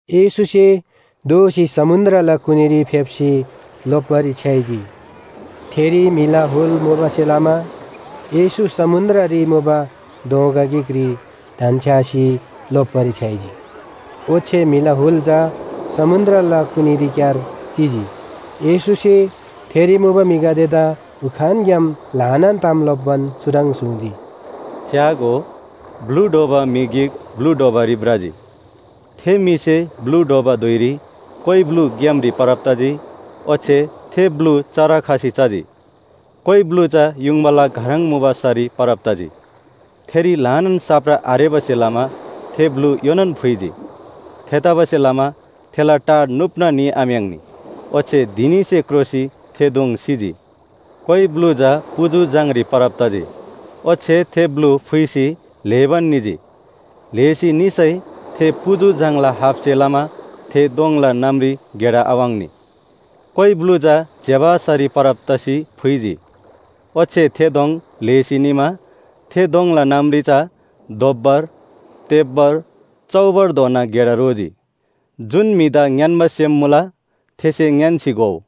येशूसे दोःसी समुन्‍द्रला कुनीरी फेप्‍सी लोप्‍बारी छ्‌याइजी। थेरी म्‍हिला हुल मुबासे लमा येशू समुन्‍द्ररी मुबा दोँगा गिकरी धन्‍छ्‌यासी लोप्‍बारी छ्‌याइजी। ओच्‍छे म्‍हिला हुल चा समुन्‍द्रला कुनीरीक्‍यार चिजी। येशूसे थेरी मुबा म्‍हिगदेदा उखानग्‍याम ल्‍हानान ताम लोप्‍बान चुह्रङ् सुङ्जी, “च्‍यागो, ब्‍लु ढ्वबा म्‍हि गिक ब्‍लु ढ्वबारी भ्रजी। थे म्‍हिसे ब्‍लु ढ्वबा धुइरी कोइ ब्‍लु ग्‍यामरी परब तजी, ओच्‍छे थे ब्‍लु चरा खसी चजी। कोइ ब्‍लु चा युङबाला घह्रङ मुबा सरी परब तजी, थेरी ल्‍हानान साप्रा आरेबासे लमा थे ब्‍लु योनान फुइजी। थेतबासेलमा थेला टा नुप्‍ना निआम्‍याङ्नी। ओच्‍छे धिनीसे क्रोसी थे दोङ सिजी। कोइ ब्‍लु चा पुजु झाङरी परब तजी, ओच्‍छे थे ब्‍लु फुइसी ल्‍हेबान निजी। ल्‍हेसी निसै थे पुजु झाङला हापसे लमा थे दोङला नमरी गेडा आवाङ्नी। कोइ ब्‍लु चा ज्‍यबा सरी परब तसी फुइजी, ओच्‍छे थे दोङ ल्‍हेसी निमा थे दोङला नमरी चा दोब्‍बर, तेब्‍बर, चौबरधोना गेडा रोजी। जुन म्‍हिदा ङ्‌यान्‍बा सेम मुला थेसे ङ्‌यान्‍सी घोउ।”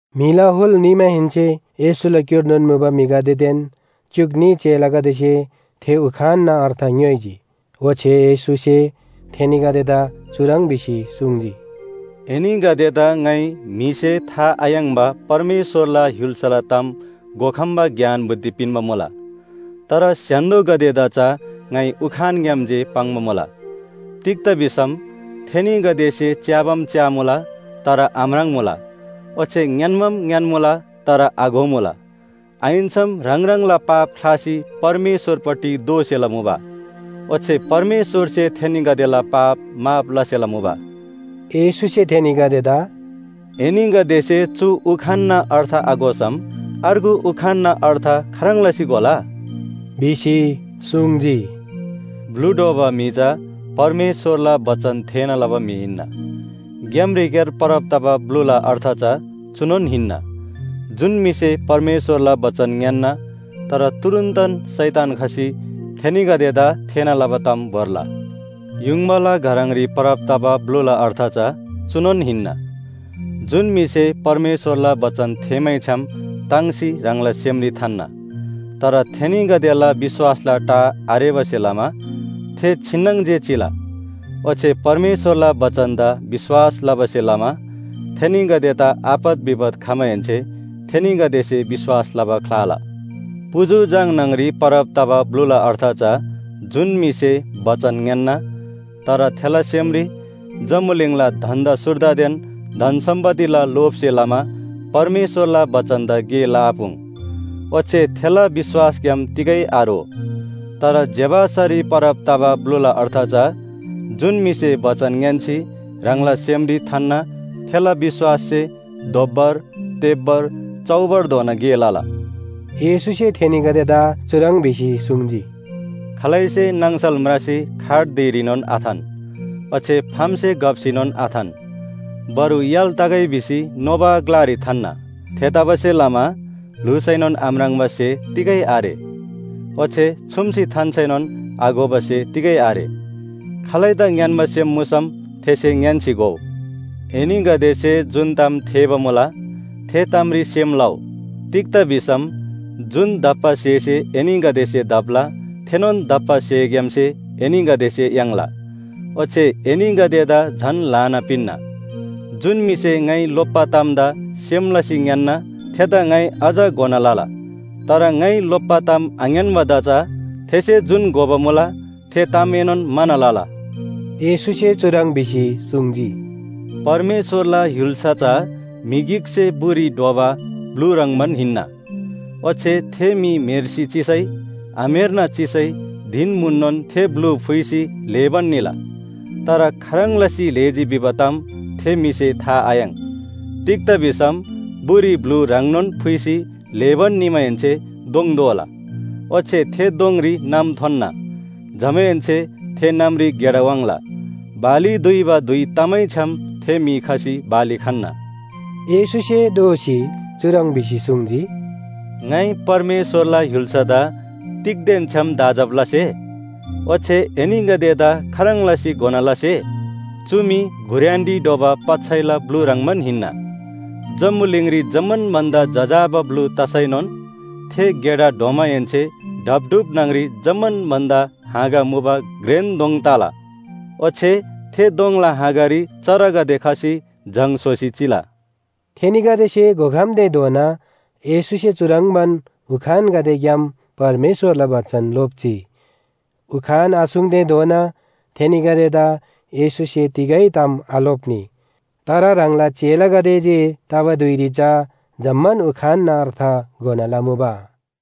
म्‍हिला हुल निमाहेन्‍से येशूला क्‍युर्नोन मुबा म्‍हिगदेदेन च्‍युक न्‍ही चेलागदेसे थे उखानना अर्थ ङ्‌योइजी। ओच्‍छे येशूसे थेनीगदेदा चुह्रङ् भिसी सुङ्जी, “एनीगदेदा ङाइ म्‍हिसे था आयाङ्‍बा परमेश्‍वरला य्‍हुल्‍साला ताम घोखम्‍बा ज्ञान बुद्धि पिन्‍बा मुला। तर स्‍य्‍हान्‍दोगदेदा चा ङाइ उखानग्‍याम जे पाङ्बा मुला। तिग्‍दा भिसम ‘थेनीगदेसे च्‍याबाम च्‍यामुला तर आम्राङ्मुला ओच्‍छे ङ्‌यान्‍बाम ङ्‌यान्‍मुला तर आघोमुला। आहिन्‍सम ह्राङ ह्राङला पाप ख्‍लासी परमेश्‍वरपट्टि दोःसेला मुबा, ओच्‍छे परमेश्‍वरसे थेनीगदेला पाप माफ लसेला मुबा।’” येशूसे थेनीगदेदा “एनीगदेसे चु उखानला अर्थ आघोसम अर्गु उखानना अर्थ खाह्रङ् लसी घोला?” भिसी सुङ्जी। ब्‍लु ढ्वबा म्‍हि चा परमेश्‍वरला बचन थेःना लबा म्‍हि हिन्‍ना। ग्‍यामरीक्‍यार परब तबा ब्‍लुला अर्थ चा चुनोन हिन्‍ना, जुन म्‍हिसे परमेश्‍वरला बचन ङ्‌यान्‍ना तर तुरुन्‍तन शैतान खसी थेनीगदेदा थेःना लबा ताम भोर्ला। युङबाला घह्रङरी परब तबा ब्‍लुला अर्थ चा चुनोन हिन्‍ना, जुन म्‍हिसे परमेश्‍वरला बचन थेःमैछ्‌याम ताङ्सी ह्राङला सेमरी थान्‍ना, तर थेनीगदेला विश्‍वासला टा आरेबासे लमा, थे छिन्‍नङ जे चिला। ओच्‍छे परमेश्‍वरला बचनदा विश्‍वास लबासे लमा थेनीगदेदा आपत विपत खमाहेन्‍से थेनीगदेसे विश्‍वास लबा ख्‍लाला। पुजु झाङ न्‍हङरी परब तबा ब्‍लुला अर्थ चा जुन म्‍हिसे बचन ङ्‌यान्‍ना तर थेला सेमरी जम्‍बुलिङला धन्‍दा सुर्दादेन धन सम्‍पत्तिला लोभसे लमा परमेश्‍वरला बचनदा गे लआपुङ्, ओच्‍छे थेला विश्‍वासग्‍याम तिगै आरो तर ज्‍यबा सरी परब तबा ब्‍लुला अर्थ चा जुन म्‍हिसे बचन ङ्‌यान्‍सी ह्राङला सेमरी थान्‍ना, थेला विश्‍वाससे दोब्‍बर, तेब्‍बर, चौबरधोना गे लला। येशूसे थेनीगदेदा चुह्रङ् भिसी सुङ्जी, “खालैसे नाङसल म्रासी खाट धिरीनोन आथान ओच्‍छे फामसे घप्‍सीनोन आथान। बरु य्‍हाल तगै भिसी नोबा ग्‍लारी थान्‍ना। थेतबासेलमा ल्‍हुसैनोन आम्राङ्बा स्‍हे तिगै आरे। ओच्‍छे छुम्‍सी थान्‍सैनोन आघोबा स्‍हे तिगै आरे। खालैदा ङ्‌यान्‍बा सेम मुसम थेसे ङ्‌यान्‍सी घोउ। “एनीगदेसे जुन ताम थेःबा मुला, थे तामरी सेम लउ। तिग्‍दा भिसम जुन दप्‍बा स्‍हेसे एनीगदेसे दप्‍ला, थेनोन दप्‍बा स्‍हेग्‍यामसे एनीगदेसे याङ्ला। ओच्‍छे एनीगदेदा झन ल्‍हाना पिन्‍ना। जुन म्‍हिसे ङाइ लोप्‍बा तामदा सेम लसी ङ्‌यान्‍ना, थेदा ङाइ अझ घोना लला। तर ङाइ लोप्‍बा ताम आङ्‌यान्‍बादा चा थेसे जुन घोबा मुला थे तामएनोन म्‍हाना लला।” येशूसे चुह्रङ् भिसी सुङ्जी, “परमेश्‍वरला य्‍हुल्‍सा चा म्‍हि गिकसे बुरी ढ्वबा ब्‍लु ह्रङ्‌बान हिन्‍ना। ओच्‍छे थे म्‍हि म्‍हेर्सी चिसै आम्‍हेर्ना चिसै धिन म्‍हुननोन थे ब्‍लु फुइसी ल्‍हेबान निला, तर खाह्रङ् लसी ल्‍हेजी भिबा ताम थे म्‍हिसे था आयाङ्। तिग्‍दा भिसम बुरी ब्‍लु ह्राङनोन फुइसी ल्‍हेबान निमाहेन्‍से दोङ दोला, ओच्‍छे थे दोङरी नम थोन्‍ना, जमाहेन्‍से थे नमरी गेडा वाङ्ला। बाली दुइबा धुइ तमैछ्‌याम थे म्‍हि खसी बाली खन्‍ना।” येशूसे दोःसी चुह्रङ् भिसी सुङ्जी, “ङाइ परमेश्‍वरला य्‍हुल्‍सादा तिगदेन छ्‌याम दाँजब लसे? ओच्‍छे एनीगदेदा खाह्रङ् लसी घोना लसे? चु मी घुर्‍यानरी ढ्वबा पच्‍छैला ब्‍लु ह्रङ्‌बान हिन्‍ना। जम्‍बुलिङरी जम्‍मान भन्‍दा जजाबा ब्‍लु तसैनोन, थे गेडा ढ्वमाहेन्‍से ढापढुप न्‍हङरी जम्‍मान भन्‍दा हाँगा मुबा घ्रेन दोङ तला। ओच्‍छे थे दोङला हाँगारी चरागदे खसी जङ स्‍होसी चिला।” थेनीगदेसे घोखम्‍तेधोना येशूसे चुह्रङ्बान उखानगदेग्‍याम परमेश्‍वरला बचन लोप्‍जी। उखान आसुङ्तेधोना थेनीगदेदा येशूसे तिगै ताम आलोप्‍नी। तर ह्राङला चेलागदे जे तबा धुइरी चा जम्‍मान उखानना अर्थ घोना लमुबा।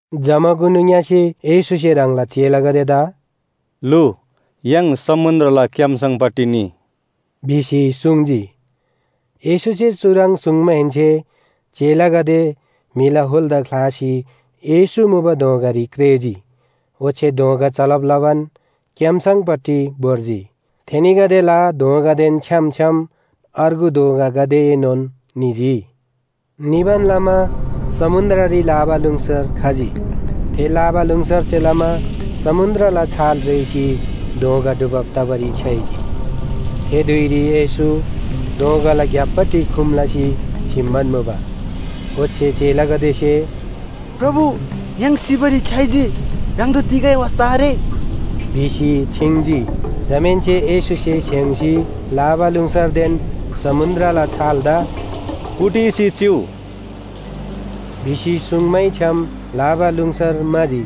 जमाकुनु ङ्‍यसे येशूसे ह्राङला चेलागदेदा “लु, य्‍हाङ समुन्‍द्रला क्‍याम्‍सङपट्टि निइ” भिसी सुङ्जी। येशूसे चुह्रङ् सुङ्माहेन्‍से चेलागदे म्‍हिला हुलदा ख्‍लासी येशू मुबा दोँगारी क्रेःजी। ओच्‍छे दोँगा चलब लबान क्‍याम्‍सङपट्टि भोर्जी। थेनीगदेला दोँगादेन छ्‌याम छ्‌याम अर्गु दोँगागदेएनोन निजी। निबान लमा समुन्‍द्ररी लाबालुङसर खजी। थे लाबालुङसरसे लमा समुन्‍द्रला छाल रेःसी दोँगा डुबब तबारी छ्‌याइजी। थे धुइरी येशू दोँगाला ग्‍यापपट्टि खुम लसी स्‍हिम्‍बान मुबा। ओच्‍छे चेलागदेसे “प्रभु, य्‍हाङ सिबारी छ्‌याइजी, ह्राङदा तिगै वास्‍ता आरे?” भिसी छिङ्जी। जमाहेन्‍से येशूसे स्‍हेङ्‌सी लाबालुङसरदेन समुन्‍द्रला छालदा “कुटिसी चिउ” भिसी सुङ्मैछ्‌याम लाबालुङसर म्‍हाजी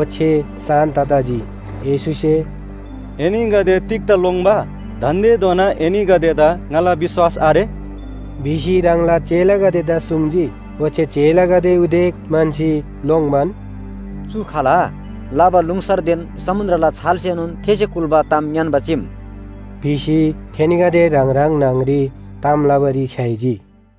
ओच्‍छे शान्‍त तजी। येशूसे “एनीगदे तिग्‍दा लोङ्‌बा? दान्‍देधोना एनीगदेदा ङाला विश्‍वास आरे?” भिसी ह्राङला चेलागदेदा सुङ्जी। ओच्‍छे चेलागदे उदेक म्‍हन्‍सी लोङ्बान, “चु खाल? लाबालुङसरदेन समुन्‍द्रला छालसेएनोन थेसे कुल्‍बा ताम ङ्‌यान्‍बा चीम!” भिसी थेनीगदे ह्राङ ह्राङ न्‍हङरी ताम लबारी छ्‌याइजी।